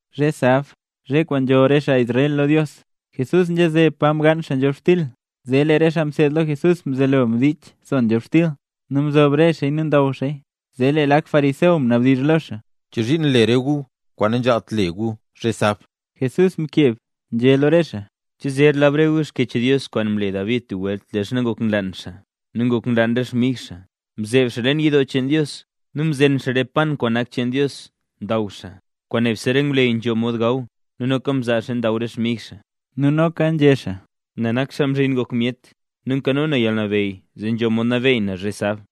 Zhe sab, zhe kwaan nzholl re xaa Israel lo Dios, Jesús nzhaze pa mgaan xaa nzhobxtil, zee lee re xaa mseed lo Jesús mzelo mdich son nzhobxtil, nu mzob re xaaya nu ndaw xaaya. —¿Chozhiin nle re gu kwaan nanzhaalt le gu zhe sab? Jesús mkeb nzhé lo re xaa: —¿Che zer lab re gu Xkyech Dios kwaan mle David tub welt leezha ngok nlaan xaa nu ngok nlaan re xmig xaa? Mzeeb xaa leen yidoo cheen Dios, nu mzen xaa re pan kwaan nak cheen Dios ndaw xaa, kwaan nebse re ngwleyy nzho mod gaw nu noka mzaa xaaya ndaw re xmig xaa. Nu noka nzhé xaa: —Na nak Xaa Mzhin Ngok Myet nu nkano na yalnabeyy zee nzho mod nabeey na zhe sab.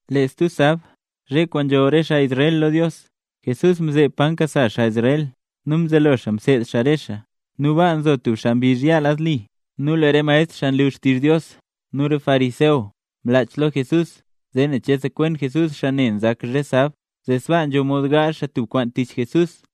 Lee stub sab, zhe kwaan nzholl re xaa Israel lo Dios, Jesús mzeeb pa nkasa xaa Israel nu mzelo xaa mseed xaa re xaa. Nu baa nzo tub xaa mbizh yaa lad li. Nu lee re maestr xaa nlu xtizh Dios nu re fariseo mlach lo Jesús zee nen che sekwen Jesús xaa ne nzak zhe sab, zee sbaa nzho mod gaazh xaa tub kwaan tich Jesús.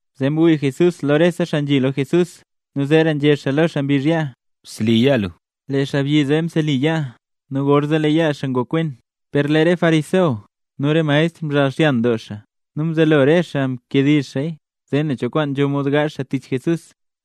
Zee mwii Jesús lo rese xaa nzhi lo Jesús, nu zeera nzhé xaa lo xaa mbizh yaa: —Bseli yaa lu. Lee xaabyi zee mseli yaa, nu gorzee lee yaa xaa ngokwen. Per lee re fariseo nu re maestr mzhaal xyan doo, nu mzelo re xaa mkediizh xaaya, zee ne cho kwaan nzho mod gaazh xaa tich Jesús.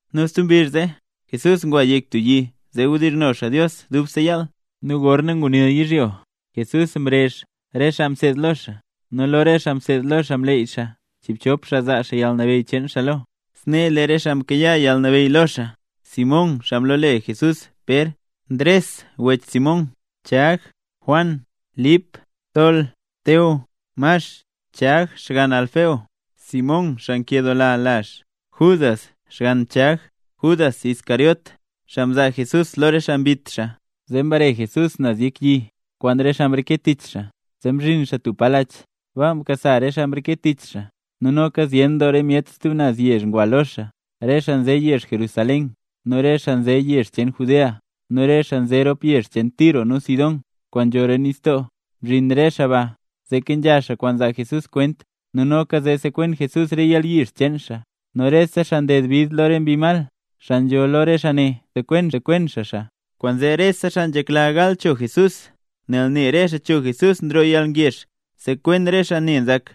Nu tub mbizh zee, Jesús ngwa yek tub yi zee wdizhno xaa Dios dubse yaal. Nu gorna ngunil yizhyo, Jesús mrezh re xaa mseed lo xaa, nu lo re xaa mseed lo xaa mleey xaa chiibchop xaa zaa xaa yalnabeyy cheen xaa lo. Snee le re xaa mkayaa yalnabeyy lo xaa: Simón (xaa mlole Jesús Pér), Ndres (wech Simón), Chag, Juan, Lip, Tol, Teo, Max, Chag (xgann Alfeo), Simón (xaa nkedoola lazh), Judas (xgann Chag), Judas Iscariote (xaa mzaa Jesús lo re xaa mbit xaa). Zee mbare Jesús naz yek yi kwaan re xaa mreke tich xaa, zee mzhin xaa tub pa lach. Baa mkasa re xaa mreke tich xaa nu noka zyen doo re myet stub naz yezh ngwa lo xaa: re xaa nze yezh Jerusalén, nu re xaa nze re yezh cheen Judea, nu re xaa nze rop yezh Tiro nu Sidón kwaan nzho roo nistoo. Mzhin re xaa baa zee kenzha xaa kwaan zaa Jesús kwent nu noka zee sekwen Jesús re yalyizh cheen xaa. Nu rese xaa nded bid lo re mbi mal, xaa nzho lo re xaa ne, msekwen xaa xaa. Kwaanzee rese xaa nzhekla gal cho Jesús, nel ne re xaa cho Jesús nroo yalngezh sekwen re xaa ne nzak.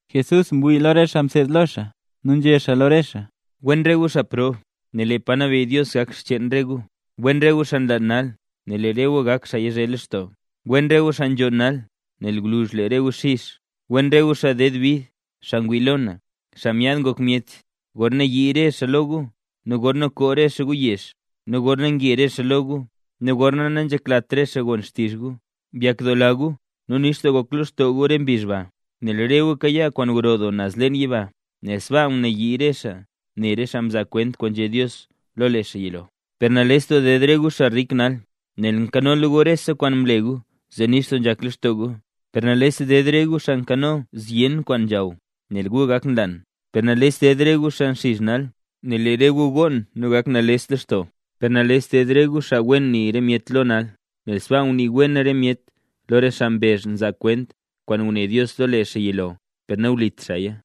Jesús mwii lo re xaa mseed lo xaa nu nzhé xaa lo re xaa: —Wen re gu xaa prob, nel lee pa nabeyy Dios gak xcheen re gu. ’Wen re gu xaa nlaan nal, nel lee re gu gak xaa yazhe lextoo. ’Wen re gu xaa nzhonn nal, nel gwluzh lee re gu xizh. ’Wen re gu xaa nded bid xaa ngwii lo na, Xaa Nyaad Ngok Myet, gorna yii re myet lo gu, nu gorna koo re xaa gu yezh, nu gorna nge re xaa lo gu, nu gorna nanzheklat re xaa gon xtizh re gu. Byakdoola gu, nu nix doo gok lextoo gu re mbizh ba, nel re gu kayaa kwaan gro doo naz leen yiba; nel sbaaka mnayii re xaa ne re xaa mzaa kwent kwaan nzhé Dios lo lee xaa yilo. ’Per nales ded re gu xaa rik nal, nel mkanola gu rese kwaan mle zee nix doo nzhak lextoo gu. ’Per nales ded re gu xaa nkano zyen doo kwaan nzhaw, nel gu gak nlaan. ’Per nales ded re gu xaa nxizh nal, nel lee re gu gonn nu gak nales doo lextoo. ’Per nales ded re gu xaa wen nii re myet lo nal, nel sbaa ngunii wen re myet lo re xaa mbezh mzaa xaa kwent kwaan nguné Dios lo lee xaa yilo per nawlit xaaya.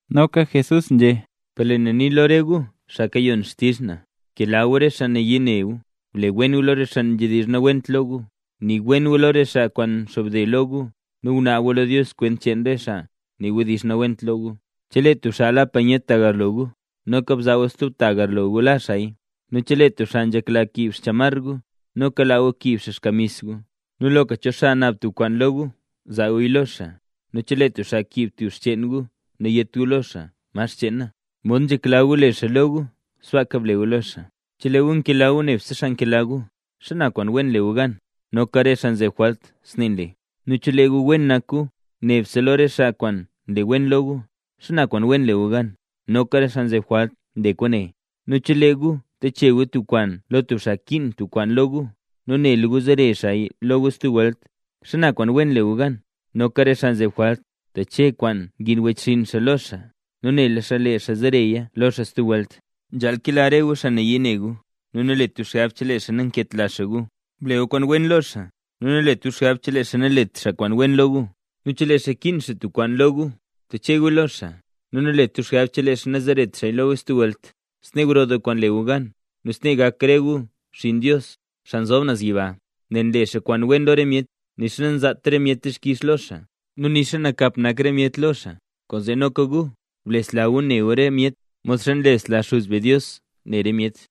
Noka Jesús nzhé: —Per lee na nii lo re gu, xaa kayon xtizh na: Bkela gu re xaa nayii ne gu, ble gu wen lo re xaa nzhedizh nawent lo gu. Nii wen gu lo re xaa kwaan nxobde lo gu, nu gunaab gu lo Dios kwent cheen re xaa nii wdizh nawent lo gu. Chelee tub xaa la panyet tagarlo gu, noka bzaa gu stub tagarlo gu la xaaya. Nu chelee tub xaa nzhekla kiib xchamar gu, noka laa gu kiib xaa xkamis gu. Nu loka cho xaa naab tub kwaan lo gu, zaa guya lo xaa, nu chelee tub xaa kiib tub xcheen gu nayét gu lo xaa: “¿Ma xcheen na?” Mod nzhekla gu le xaa lo gu, sbaaka ble gu lo xaa. ’Chelee gu nkela gu nebse xaa nkela gu, ¿xana kwaan wen le gu gan? Noka re xaa nzeb jwalt snee nle. Nu chelee gu wen nak gu nebse lo re xaa kwaan nle wen lo gu, ¿xana kwaan wen le gu gan? Noka re xaa nzeb jwalt nle kwaane. Nu chelee gu nteche gu tub kwaan lo tub xaa kiin tub kwaan lo gu, nu nela gu zere xaaya lo gu stub welt, ¿xana kwaan wen le gu gan? Noka re xaa nzeb jwalt nteche kwaan ngiin wechxinn xaa lo xaa, nu nela xaa lee xaa zereya lo xaa stub welt. Nzhaal kela re gu xaa nayii ne gu nu nalet gu xgab chelee xaa nanketla xaa gu. Ble gu kwaan wen lo xaa nu nalet gu xgab chelee xaa nalet xaa kwaan wen lo gu, nu chelee xaa kiin xaa tub kwaan lo gu teche guya lo xaa nu nalet gu xgab chelee xaa nazeret xaaya lo gu stub welt. Snee gro doo kwaan le gu gan, nu snee gak re gu xinn Dios, xaa nzob naz yiba, nel nle xaa kwaan wen lo re myet, nixa nanzaat re myet dixkix lo xaa nu nixa nakap nak re myet lo xaa. Kwaanzee noka gu blesla gu ne gu re myet, modxa nlesla Xuz be Dios ne re myet.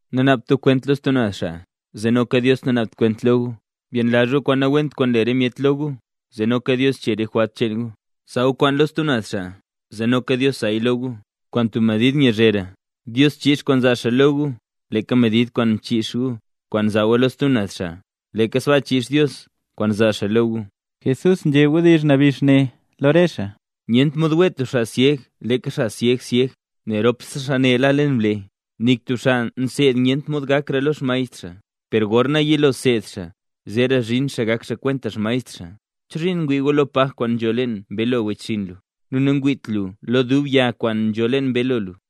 ’Nanaabt gu kwent lo stub xaa zee noka Dios nanaabt kwent lo gu. Byenlazh gu kwaan nawent kwaan nle re myet lo gu, zee noka Dios chee re jwalt cheen gu. Zaa gu kwaan lo stub naz xaa, zee noka Dios zaaya lo gu, kwaan tub medid nyazhera. Dios chiix kwaan zaa xaa lo gu leeka medid kwaan mchiix gu kwaan mzaa gu lo stub naz xaa, leeka sbaa chiix Dios kwaan zaa xaa lo gu. Jesús nzhé wdizh nabix ne lo re xaa: —Nyent mod wee tub syeg leeka sasyeg syeg, nel rop xaa ne la leen blee. Nik tub xaa mseed nyent mod gakra lo xmaestr xaa, per gorna yilo seed xaa, zeera zhin xaa gak xaa kwenta xmaestr xaa. ’¿Chozhiin ngwii lu lo paj kwaan nzho leen mbeelo wechxinn lu, nu nangwiit lu lo dub yag kwaan nzho leen mbeelo lu?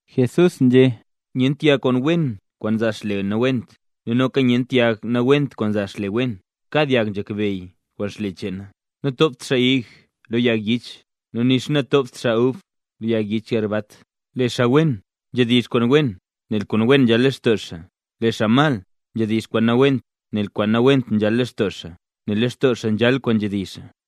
Jesús nzhé: —Nyent yag kwaan wen kwaan nzaa xle nawent. Nu noka nyent yag nawent kwaan nzaa xle wen. Kad yag nzhakbeyy kwaan xle cheena. Nantopt xaa ig lo yag yich, nu nixa nantopt xaa ub lo yag yich garbat. Lee xaa wen, nzhedizh kwaan wen, nel kwaan wen nzhal lextoo xaa. Lee xaa mal, nzhedizh kwaan nawent, nel kwaan nawent nzhal lextoo xaa. Nel lextoo xaa nzhal kwaan nzhedizh xaa.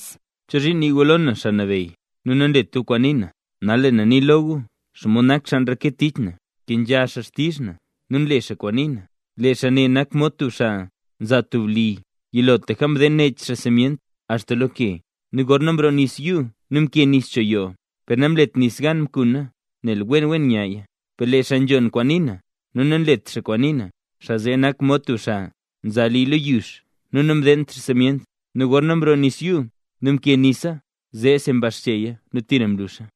’¿Chozhiin nii gu lo na “Xaa Nabeyy”, nu nanlet gu kwaan nii na? Nal lee na nii lo gu xomod nak xaa nreke tich na; nkenzha xaa xtizh na nu nle xaa kwaan nii na. Lee xaa ne nak mod tub xaa mza tub li. Yilotlaka mdeen nech xaa simyent axta lo ke. Nu gorna mroo nis yuu nu mkee nis cho yoo, per namlet nis gan mkuna nel wen wen nyaya. Per lee xaa nzhon kwaan nii na, nu nanlet xaa kwaan nii na, xaa zee nak mod tub xaa mza li lo yux nu namdeent xaa simyent. Nu gorna mroo nis yuu, nu mkee nisa, zee mbaxcheya nu tira mluxa.